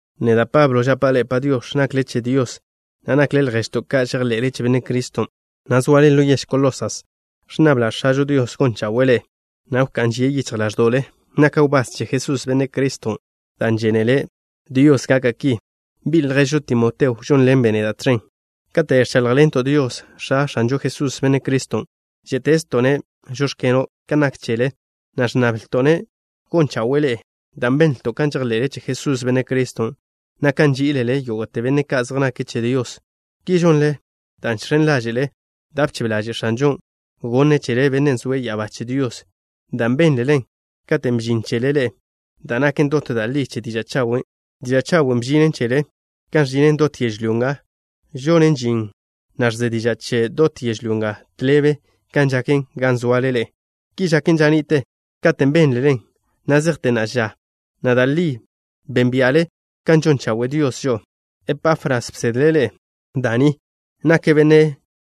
Neda', Pablo, žapa' ḻe'e “Padiox̱”, nakle che Dios, na' nakle lježto' ka' žejḻe'le che Benne' Criston', na' zoale ḻo yež Colosas. Ẕnnabla' X̱ažo Dios gon chawe'e ḻe'e, na' wká'n žie' yichj ḻáẕdo'le. Naka' wbás che Jesús, Benne' Criston', dan' žénele Dios gaka' ki. Bi' lježžo Timoteo žónḻenbe' neda' tẕen. Kate' ẕcháḻjḻento' Dios, X̱a X̱anžo Jesús, Benne' Criston', žé'tezto'-ne': “Žóx̱keno'” ka nak chele, na' ẕnnablto'-ne' gon chawe'e ḻe'e dan' benlto' kan žejḻe'le che Jesús, Benne' Criston', na' kan nží'ilele yógo'te benne' ka' zej nake' che Dios. Ki žonle dan' žx̱en ḻáže'le da' bchebe ḻaže' X̱anžon' gonne' chele, Bennen' zoe' ya'abá che Dios, dan' bénlelen katen' bžin chele ḻe'e da' naken dot da' li che diža' chawen'. Diža' chawen' bžinen chele kan ẕžinen dot yežlyó nga. Žonen žin, na' ẕze diža' chen dot yežlyó nga, tḻebe kan žaken gan zoale ḻe'e. Ki žaken ža ni'te katen' bénlelen, na' zejte na'a ža, na' da' li bénbia'le kan žon chawe' Dios žo'o. Epafras bsedle' ḻe'e da' ni. Nake' benne'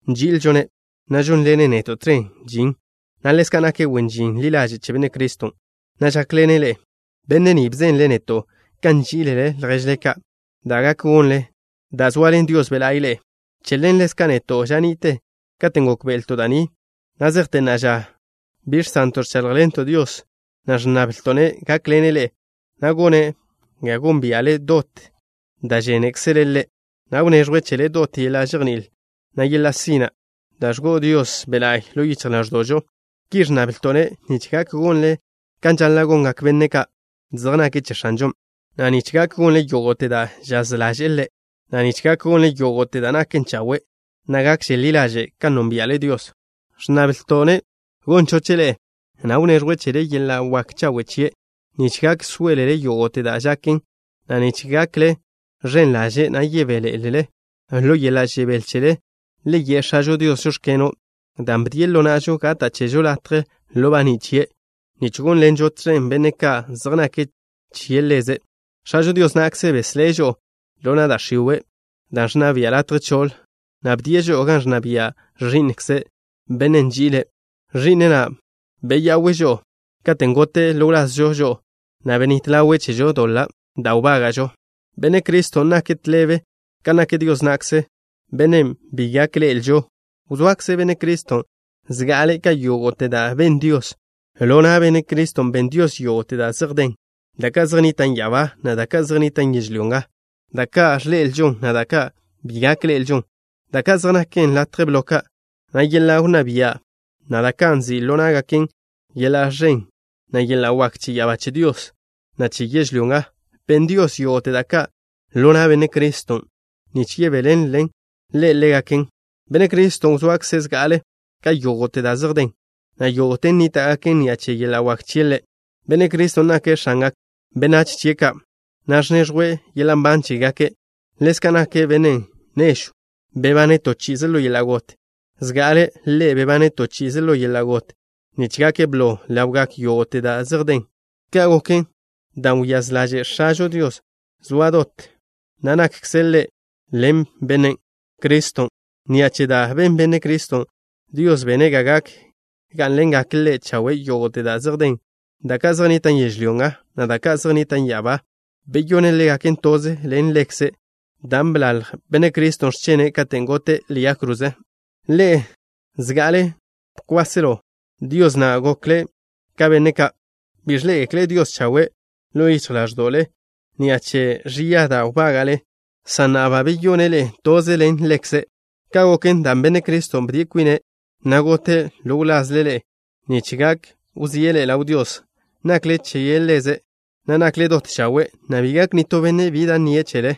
nži'ilžo-ne', na' žónḻene' neto' tẕen žin, na' ḻezka' nake' wen žin ḻi ḻaže' che Benne' Criston', na' žákḻene' ḻe'e. Benne' ni bzenle' neto' kan nží'ilele lježle ka', da' gak gonlen dan' zoaḻen Dios Be' La'y ḻe'e. Che ḻen ḻezka' neto', ža ni'te katen' gókbe'elto' da' ni, na' zejte na'a ža bi žsento' ẕcháḻjḻento' Dios, na' ẕnnablto'-ne' gákḻene' ḻe'e, na' gone' ga gónbia'le dot da' žénekzele' Ḻe', na' wneẕjwe' chele dot yeḻa' žejní'il, na' yeḻa' sina' da' ẕgo'o Dios Be' La'y ḻo yichj ḻáẕdo'žo. Ki ẕnnablto'-ne' nich gak gonle kan žaḻa' gongak benne' ka' zej nake' che X̱anžon', na' nich gak gonle yógo'te da' žaz ḻaže'e Ḻe', na' nich gak gonle yógo'te da' naken chawe', na' gakže ḻi ḻaže' kan nónbia'le Dios. Ẕnnablto'-ne' gon choche' ḻe'e, na' wneẕjwe' chele yeḻa' wak chawe' chie', nich gak sóelele yógo'te da' žaken, na' nich gakle ẕen ḻaže', na' yebéḻe'elele. Ḻo yeḻa' žebél chele le ye' X̱ažo Dios: “Žóx̱keno'” dan' bdie' ḻo na'žo gata' chežo latje ḻo baní' chie', nich gónḻenžo tẕen benne' ka' zej nake' che Ḻeze'. X̱ažo Dios na'kze beslé' žo'o ḻo na' da' x̱iwe', dan' ẕnna bian' latje choḻ, na' bdie' žo'o gan ẕnna bia' Ẕi'nkze', Bennen' nži'ile'. Ẕi'ne' na' beya'we' žo'o, katen' gote' ḻo wlazžo žo'o, na' benít ḻawe' chežo doḻa' da' wbága'žo. Benne' Criston' nake' tḻebe kan nak Dios na'kze, Bennen' bi gak ḻe'elžo. Wzoakze Benne' Criston' zga'ale' ka yógo'te da' ben Dios. Ḻo na' Benne' Criston' ben Dios yógo'te da' zej den, da' ka' zej nnitan' ya'abá, na' da' ka' zej nnitan' yežlyó nga, da' ka' ẕḻe'elžon, na' da' ka' bi gak ḻe'elžon, da ka' zej naken latje blo ka', na' yeḻa' wnná bia', na' da' ka' nzi' ḻo ná'gaken yeḻa' ẕen, na' yeḻa' wak che ya'abá che Dios, na' che yežlyó nga. Ben Dios yógo'te da' ka' ḻo na' Benne' Criston' nich yebéḻenle' Ḻe' ḻégaken. Benne' Criston' wzoakze' zga'ale' ka yógo'te da' zej den, na' yógo'ten nníta'gaken ni'a che yeḻa' wak chie' Ḻe'. Benne' Criston' nake' X̱angak benách chie' ka', na' ẕneẕjwe' yeḻa' nban chégake'. Ḻezka' nake' Bennen' nežw bebane' to chi'ize ḻo yeḻa' got. Zga'ale' Ḻe' bebane' to chi'ize ḻo yeḻa' got nich gake' blo ḻawgak yógo'te da' zej den. Ka' goken dan' wyáz ḻaže' X̱ažo Dios soa dot da' nakkze' Ḻe' ḻen Benne' Criston'. Ni'a che da' ben Benne' Criston', Dios bene' ga gak gá'nḻengak Ḻe' chawe' yógo'te da' zej den, da' ka' zej nnitan' yežlyó nga, na' da' ka' zej nnitan' ya'abá. Beyone' ḻégaken toze ḻen Ḻekze' dan' bḻalj Benne' Criston' x̱chene' katen' gote' ḻe'e yag kroze. Ḻe'e, zga'ale bkwásḻenle Dios, na' gokle ka benne' ka' bi ẕḻé'egekle' Dios chawe' ḻo yichj ḻáẕdo'le ni'a che ẕia da' wbága'le, san na'a ba beyone' ḻe'e toze ḻen Ḻekze'. Ka' goken dan' Benne' Criston' bde kwine', na' gote' ḻo wlazle ḻe'e nich gak wzíe' ḻe'e ḻaw Dios, nakle che Ḻeze', na' nakle dot chawe', na' bi gak nitó benne' bi da' nnie' chele.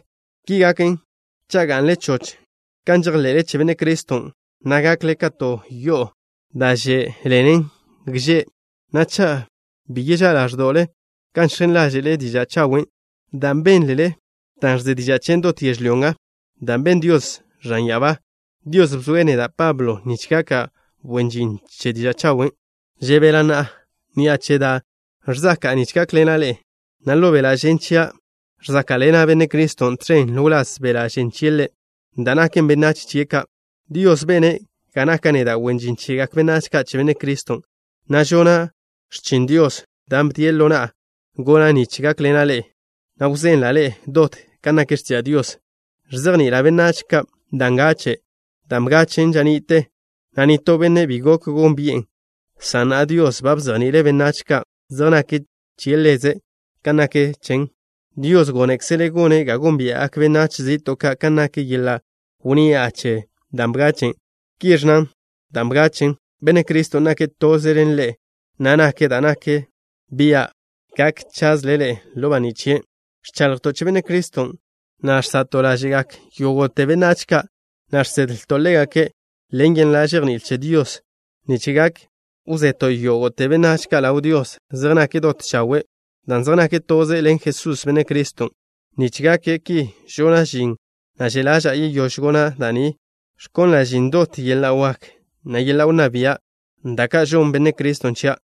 Ki gaken cha' ga'nle choch kan žejḻe'le che Benne' Criston', na' gakle ka to yo'o da' že' ḻenen gže', na' cha' bi cha' ḻáẕdo'le kan žx̱en ḻáže'le diža' chawen' dan' bénlele, dan' ẕze diža' chen dot yežlyó nga dan' ben Dios ẕan ya'abá. Dios bzoe' neda', Pablo, nich gaka' wen žin che diža' chawen'. Žebela' na'a ni'a che da' ẕzaka'a nich gákḻena' ḻe'e, na' ḻo beḻa' žen chia' ẕzáka'ḻena' Benne' Criston' tẕen ḻo wláz beḻa' žen chie' Ḻe', da' naken benách chie' ka'. Dios bene' ga naka' neda' wen žin chegak benách ka' che Benne' Criston', na' žona' x̱chin Dios, dan' bdie' ḻo na'a gona' nich gákḻena' ḻe'e, na' wzenla' ḻe'e dot kan nak x̱tiža' Dios. Ẕzejni'ila' benách ka' da' ngache', dan' bgachen' ža ni'te, na' nitó benne' bi gok gónbi'en, san na'a Dios ba bzejni'ile' benách ka' zej nake' che Ḻeze' kan nak chen. Dios gónekzele' gone' ga gónbia'gak benách zi'to' ka' kan nak yeḻa' wnni'a che dan' bgachen'. Ki ẕnna dan' bgachen': “Benne' Criston' nake' toze ḻen ḻe'e, na' nake' da' nak bian' gak chazle ḻe'e ḻo baní' chie'.” Ẕchaḻjto' che Benne' Criston', na' žsa'to' ḻáže'gak yógo'te benách ka', na' žsedlto' ḻégake' ḻen yeḻa' žejní'il che Dios, nich gak wzeto' yógo'te benách ka' ḻaw Dios, zej nake' dot chawe' dan' zej nake' toze ḻen Jesús, Benne' Criston'. Nich gaken ki žona' žin, na' že' ḻaža'a yeyóž gona' da' ni, ẕkonla' žin dot yeḻa' wak, na' yeḻa' wnná bia', da' ka' žonn Benne' Criston' chia'.